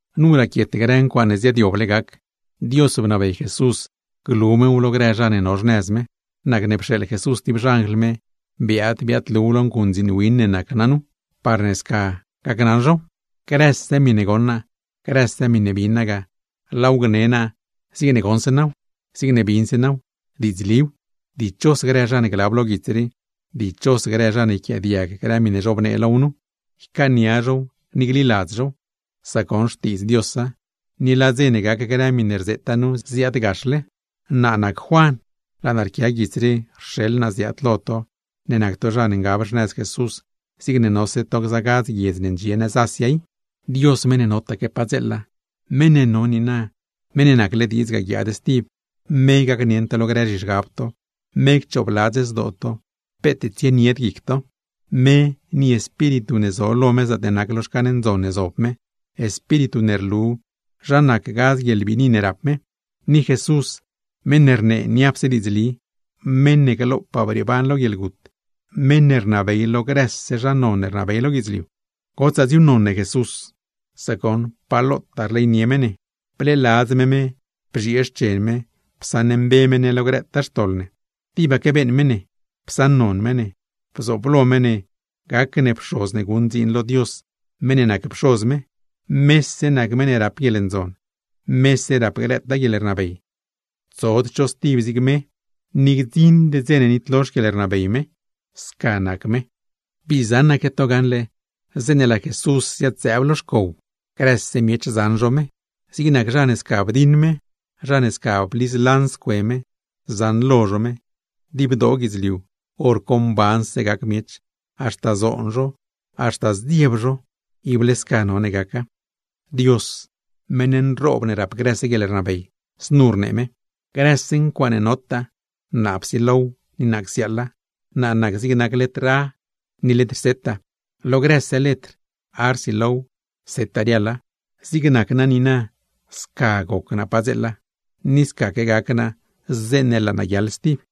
Nu raquiet grë ncuaaṉe ziaadyoble gac. Dios bnabey Jesús glu mew lo grë zha ne no xnëz me. Nacne pxeeḻ Jesús tib xanjl me biaad biaadluw lo nguṉdziin win ne nac naa nu, parne sca gacnaṉ zhow. Grëse miṉe goṉ naa, grëse miṉe bin naa ga, laaw gne naa zigne goṉse naaw, zigne binse naaw. ¡Diidzliw! Dichos grë zha ne glab lo guits rii, ni dichos grë zha ne yquiaadiag grë miṉe zhobnee low nu, ycaania zhow ni gliladz zhow; sac goṉ xtiidz Diosa, ni laa dze ne gac grë miṉe rzeeta nu, ziaadgaxle. Naa nac Juan, laa naa rquia guits rii rxeḻ naa ziaad lo to i, ne nac to zha ne ngab xnëz Jesús, zigne nose to gza gadz guiedz ne ndxie nëz Asia i. Dios meṉ ne no padzeela, meṉ ne no niina, meṉ ne nacle diidz guiaad, me gacnieṉ to lo grë zhizhgab to, me cchoobladz zdoo to peet tsienied guic to; me ni Espíritu ne zo lo me zaatne nac lo xcan ndzon ne zob me; Espíritu ne rlu zha nac gadz guieḻbiini ne rap me; ni Jesús meṉ ne rnee niapse diidzli, meṉ ne glopaa brieeban lo guieḻgut, meṉ ne rnabey lo grëse zha non ne rnabey lo guidzliu. ¡Gotsaa dziuuṉnon ne Jesús! Sac goṉ pa lotaa rleynie me ne, bleeladz me me bzhiee xchen me psaṉmbe me ne lo grëtaa xtoḻ ne, tibaque beeṉ me ne, psaṉnon me ne; bzooblo me ne gac ne pxoz ne guṉ dziin lo Dios meṉ ne nac Pxoz me. ¡Mese nac meṉ ne rap guieḻndzon, mese rap grëtaa guieḻrnabey! ¡Tsod cho stib zig me, ni gdziṉd dze ne nitlo xquieḻrnabey me! Sca nac me. ¡Bii zaṉaque to gaṉle zeeṉe laa Jesús ziad-zëëb lo xcow! Grëse miech zaṉ zho me, zig nac zha ne sca bdiṉ me, zha ne sca bliz lanz cue me, zaṉlo zho me; dibdoo guidzliu, hor co mbanse gac miech, haxta zoon zho, haxta zdzieb zho. Ible sca none gaca. Znu rnee Dios, meṉ nroob ne rap grëse guieḻrnabey: “Grëse ncuaaṉe notaa, naa psilow ni naa csiaaḻa; naa nac zigne nac letr “a” ni letr “z” lo grëse letr, “a” rsilow, “z” riaḻa, zigne nac naa niina sca goc naa padzeela, ni scaque gac naa zeeṉe laa naa guiaḻ stib.”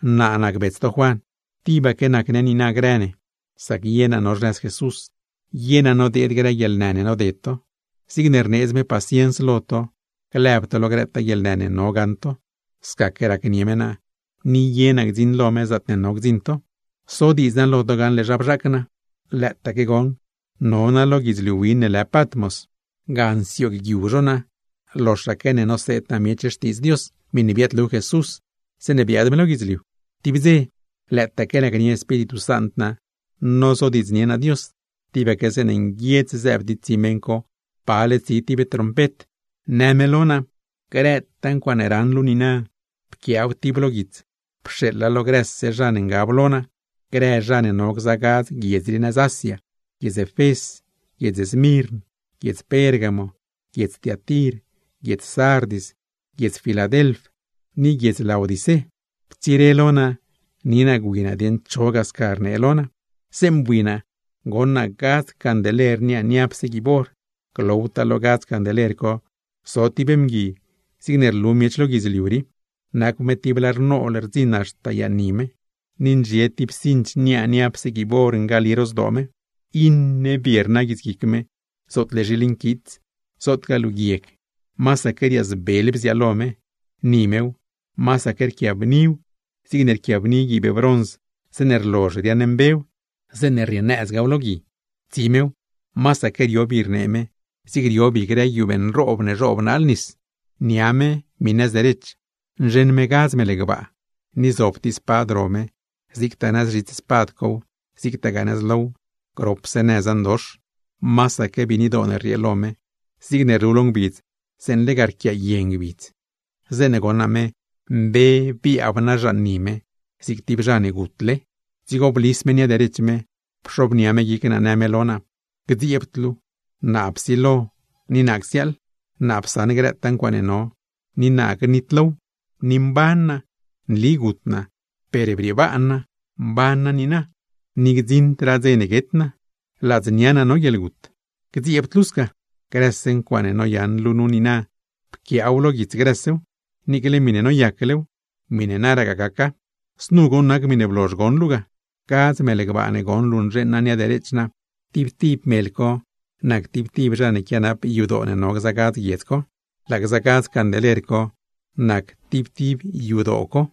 Naa nac bets to Juan, tibaque nac ne niina grë ne, sac ye naa no xnëz Jesús; ye naa nodeed grë guieḻnë ne noded to. Zigne rneedz me paciens lo to lëb to lo grëtaa guieḻnë ne no gaṉ to, scaque racnieṉ me naa; ni ye naa gdziṉ lo me, zaatne no gdziṉ to. Sodiidz naa lo to gaṉle zha bzhaac naa. Lëëtaaque no naa lo guidzliu win ne lë Patmos, ga ngoguiu zho naa loxaque ne noseed naa miech Xtiidz Dios, miṉe biaadlu Jesús zeeṉe biaad me lo guidzliu. Tib dze, lëëtaque nacnie Espíritu Sant naa nozodiidznie naa Dios, tibaque zeeṉe nguiedz zëëb tib tsi meṉ co, pale tsi tib trompet; në me lo naa: ―Grëtaa ncuaaṉe raṉ luu nu niina, pquiaaw tib lo guits pxeeḻa lo grëse zha ne ngab lo naa, grë zha ne no gza gadz guiedz rii nëz Asia: Efés, Smirn, Pérgamo, Tiatir, Sardis, Filadelf, ni Laodicé. Ptsire lo naa ni naa gwi naa dieṉ cho ga sca rnee lo naa. Zeeṉe bui naa, goṉ naa gadz candeler niaa niapse guiib or. Glowtaa lo gza candeler co zo tib mgui zigne rlu miech lo guidzliu rii, nacw me tib lar nool rdziṉa haxta yaṉ ni me, ni ndxie tib cinch niaa niapse guiib or ngali ro zdoo me. Iṉe bie rna guitsguic me, zootle zhiil nquits, zootgaa luu guieg, masaque riaazbel bziaalo me. Ni mew, masaque rquiabniw zigne rquiabni guiib brons zeeṉe rlozh riaaṉmbew, zeeṉe rrieenëzgaaw lo gui; tsi mew, masaque rio bi rnee me zig rio bi grë guiubee nroob ne zhoob naal nis. Nia me miṉe nëz derech, nzheṉ me gadz mel gbaa; ni zob tib spad ro me, zigtaa nëz zhits spad cow zigtaa nëz low, gropse nëza ndox. Masaque biinidoo ne rriee lo me, zigne rlu lo ngbidz zeeṉe lega recye lo ngbidz. Zeeṉe goṉ naa me, mbe biaab naa zhan ni me zig tib zha ne gutle. Dzigo blis me nia derech me pxobnia me guic naa, në me lo naa: ―¡Gdzieebd luu! Naa psilo ni naa csiaaḻ, naa psaṉ grëtaa ncuaaṉe no, ni naa gnitlow; ni mban naa. Nli gut naa per briebaan naa, mban naa niina, ni gdziṉdraa dze ne guet naa; ladznia naa no guieḻgut. ¡Gdzieebd luu sca! Grëse ncuaaṉe noyaṉ luu nu niina, pquiaaw lo guits grësew, niicle miṉe noyaclew, miṉe naragaa gaca. Znu goṉ nac miṉe blozh goṉ luu ga: gadz mel gbaa ne goṉ luu nzheeṉ naa ga con nia derech naa, tib tib mel co nac tib tib zha ne quianap yadoo ne no gza guiedz co; laa gza gadz candeler co, nac tib tib yadoo co.